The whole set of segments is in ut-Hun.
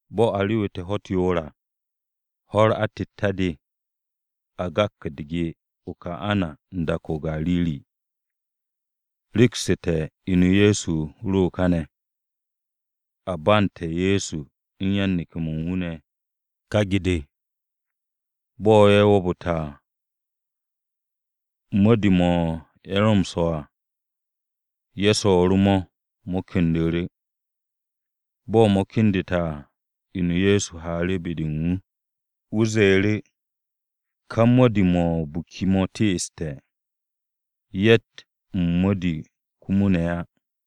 Bo̱ a rewu̱te̱ ho̱-u̱t yoor à, ho̱-u̱r atette̱-de, a gak u̱r-ge o-Kana u̱n dak-o̱ o-Gariri. Reksu̱te̱ inu-o Ye̱so ro káne̱. A bandte̱ Ye̱so u̱n yan-neke̱-mo̱ u̱n wu̱ ne̱ u̱n ká ge-de. Bo̱ ye̱ wo̱o̱bu̱te̱ à, mo̱di-mo̱, ye̱ ro m-swo̱ à, ye̱ swo̱o̱ru̱ mo̱, mo̱ kendu̱ru̱. Bo̱ mo̱ kendu̱te̱ à, inu-o Ye̱so haaru̱ be-de u̱n wu̱, wu̱ ze̱e̱ru̱, “Ka mo̱di-mo̱ o-biki mo̱ teeste̱. Ye̱tt m-mo̱di komo ne̱ á.”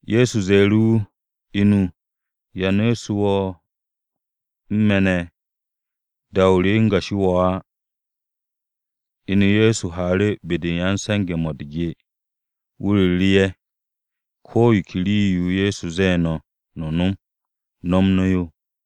Ye̱so ze̱e̱ru̱ wu̱, “Inu, ¿ya nu̱'u̱su̱ wo̱ u̱n me̱ ne̱? Da-o re, o̱ u̱ngo̱ wo̱ á.” Inu Ye̱so haaru̱ be-de u̱n ya-m-se̱nge̱-mo̱ u̱r-ge, wu̱ ru̱ru̱ ye̱, “Ko̱ yo ke rii-yo Ye̱so ze̱e̱ no̱, no̱ nom, no̱m no̱ yo.”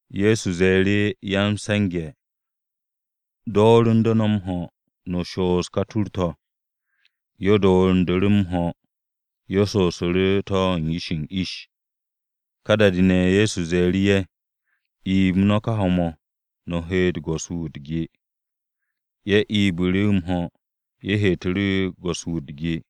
Ye̱so ze̱e̱ru̱ ya-m-se̱nge̱, “Dooru̱nde̱ no̱ m-ho̱, no̱ shoos ka tur-to̱.” Ye̱ dooru̱ndu̱ru̱ m-ho̱. Ye̱ shoosu̱ru̱ to̱ u̱n ish u̱n ish. Ká da-de ne̱ Ye̱so ze̱e̱ru̱ ye̱, “Iib no̱ ka ho̱-mo̱, no̱ heete̱ go̱s-wu̱, wu̱ u̱r-ge.” Ye̱ ibu̱ru̱ m-ho̱, ye̱ heetu̱ru̱ go̱s-wu̱ wu̱ u̱r-ge.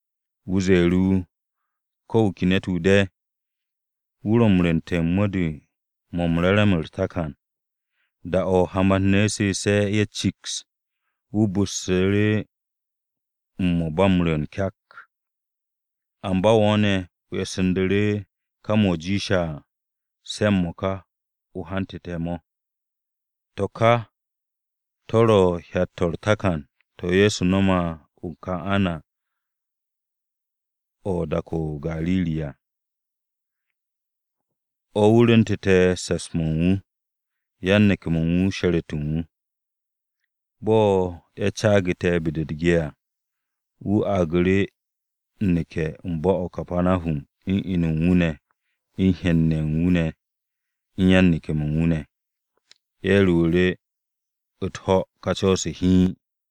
Wu̱ ze̱e̱ru̱ wu̱, “Ko̱ wu̱ ke ne̱t-wu̱ de̱ wu̱ ro̱ u̱n rwu̱nte̱ u̱n mo̱di-mo̱ m-re̱re̱m u̱r-takan. Da-o̱ hamat-ne̱ su̱u̱se̱ ye̱ ciks, wu̱ bu̱stu̱ru̱ u̱n mo̱ ba m-rwu̱u̱n kyak, amba wo̱ ne̱, o e̱ssu̱ndu̱ru̱ ká mo̱ jiishe̱ à se̱ m-mo̱ka o hante̱ mo̱.” To̱ kà to̱ ro hyat-to̱ u̱r-takan, to̱ Ye̱so no̱me̱ o-Kana o̱ u̱n dak-o̱ o-Gariri à. O̱ wu̱ rwu̱ntu̱te̱ se̱ps-mo̱ u̱n wu̱, yan-neke̱-mo̱ u̱n wu̱ sheret u̱n wu̱. Bo̱ ye̱ caagu̱te̱ be-de u̱r-ge à, wu̱ argu̱ru̱ m-neke̱ bo̱-o̱ o-Kapanahum u̱n inu u̱n wu̱ ne̱, u̱n hen-ne̱ ye̱ u̱n wu̱ ne̱, u̱n yan-neke̱-mo̱ u̱n wu̱ ne̱. Ye̱ rewu̱ru̱ u̱t-ho̱ ka co̱-se ne̱ hiin.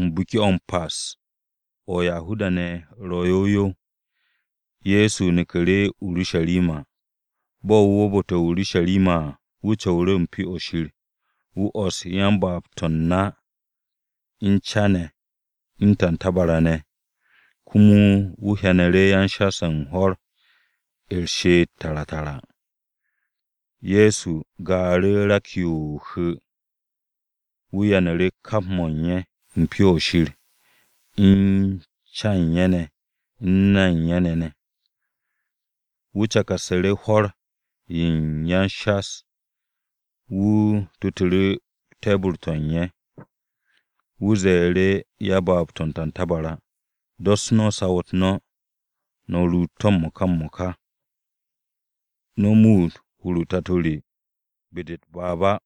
Biki-o̱ m-Pas o̱ u̱n Yahuda-ne̱ o̱ ro̱ yow yow, Ye̱so neku̱ru̱ o-Urusharima. Bo̱ wu̱ wo̱o̱bu̱te̱ o-Urusharima à, wu̱ co̱wu̱ru̱ u̱n Pyo-o̱ Shir. Wu̱ o̱ss yan-baab-to̱ u̱n na, u̱n ca-ne̱, u̱n tantabara-ne̱. Komo wu̱ hyanu̱ru̱ yan-shas-o̱ u̱n hwo̱r u̱r-she'et tara tara. Ye̱so gaaru̱ rak-yo o-hu̱, wu̱ yanu̱ru̱ kap mo̱ u̱n ye̱ u̱n Pyo-o̱ Shir u̱n ca-ye̱ u̱n ye̱ ne̱, u̱n na-ye̱ u̱n ye̱ ne̱. Wu̱ cakarsu̱ru̱ hwo̱r-ye̱ u̱n ya-o-shas. Wu̱ tutu̱ru̱ te̱bu̱r-to̱ u̱n ye̱. Wu̱ ze̱e̱ru̱ yan-baab-to̱ u̱n tantabara, “Dos no̱ saw-u̱t no̱, no̱ ruut to̱ m-mo̱ka m-mo̱ka. No̱ muut hur-o Tato re be-de u̱t-baab á!”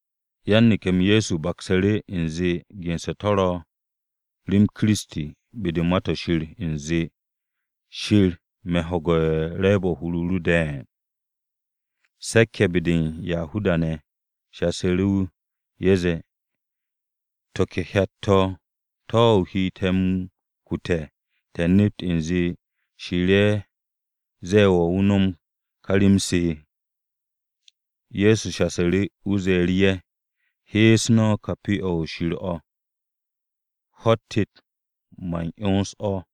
Yan-neke̱-m Ye̱so baksu̱ru̱ u̱nze ge̱nse̱ to̱ ro̱ rem Kiristi be-de u̱n Ma-to̱ Shir u̱nze, “Shir, me̱ m-ho̱ge̱ u̱n re̱e̱b-o̱ u̱n hur-o ru de̱e̱n.” Se̱k-ye̱ be-de u̱n Yahuda-ne̱ shasu̱ru̱ wu̱, ye̱ zee, “To̱, ¿to̱ ke hyat-to̱ to̱ o he te̱ m-kute̱, te̱ nept u̱nze Shir-ye̱ ze̱e̱ wo̱ o nom ka rem-se?” Ye̱so shasu̱ru̱, wu̱ ze̱e̱ru̱ ye̱, “He̱e̱s no̱ ka Pyo-o̱ Shir o̱, ho̱-u̱t tet man 'yons o̱.”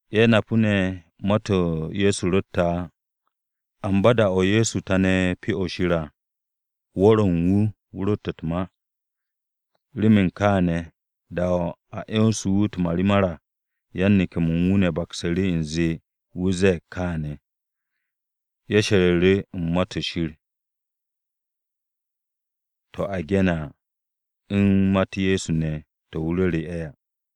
Ye̱ napu̱ ne̱ ma-to̱ Ye̱so ro̱tte̱ á. Amba da-o̱ Ye̱so tane̱ Pyo-o̱ Shir à, wu̱r-o̱ u̱n wu̱ wu̱ rotte̱ u̱t-ma. Remen kaane̱ da-de a 'yonse̱ wu̱ u̱t-marimar à, yan-neke̱-mo̱ u̱n wu̱ baksu̱ru̱ u̱nze wu̱ ze̱e̱g kaane̱. Ye̱ she̱ru̱ru̱ u̱n Ma-to̱ Shir ne̱ to̱ a ge̱ne̱ à u̱n ma-u̱t Ye̱so ne̱ to̱ wu̱ ru̱re̱ ye̱ à.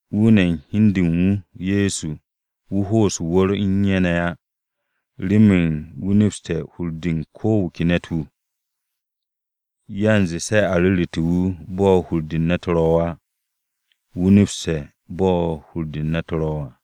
Wu̱ ne̱ u̱n hi u̱n de u̱n wu̱, Ye̱so, wu̱ ho'os o-wu̱r u̱n ye̱ ne̱ á, remen wu̱ nepste̱ hur-de u̱n ko̱ wu̱ ke ne̱t-wu̱. Yanze se a ru̱ru̱te̱ wu̱ bo̱ hur-de u̱n ne̱t ro̱ á. Wu̱ nepste̱ bo̱ hur-de u̱n hun-ne̱ ro̱ à.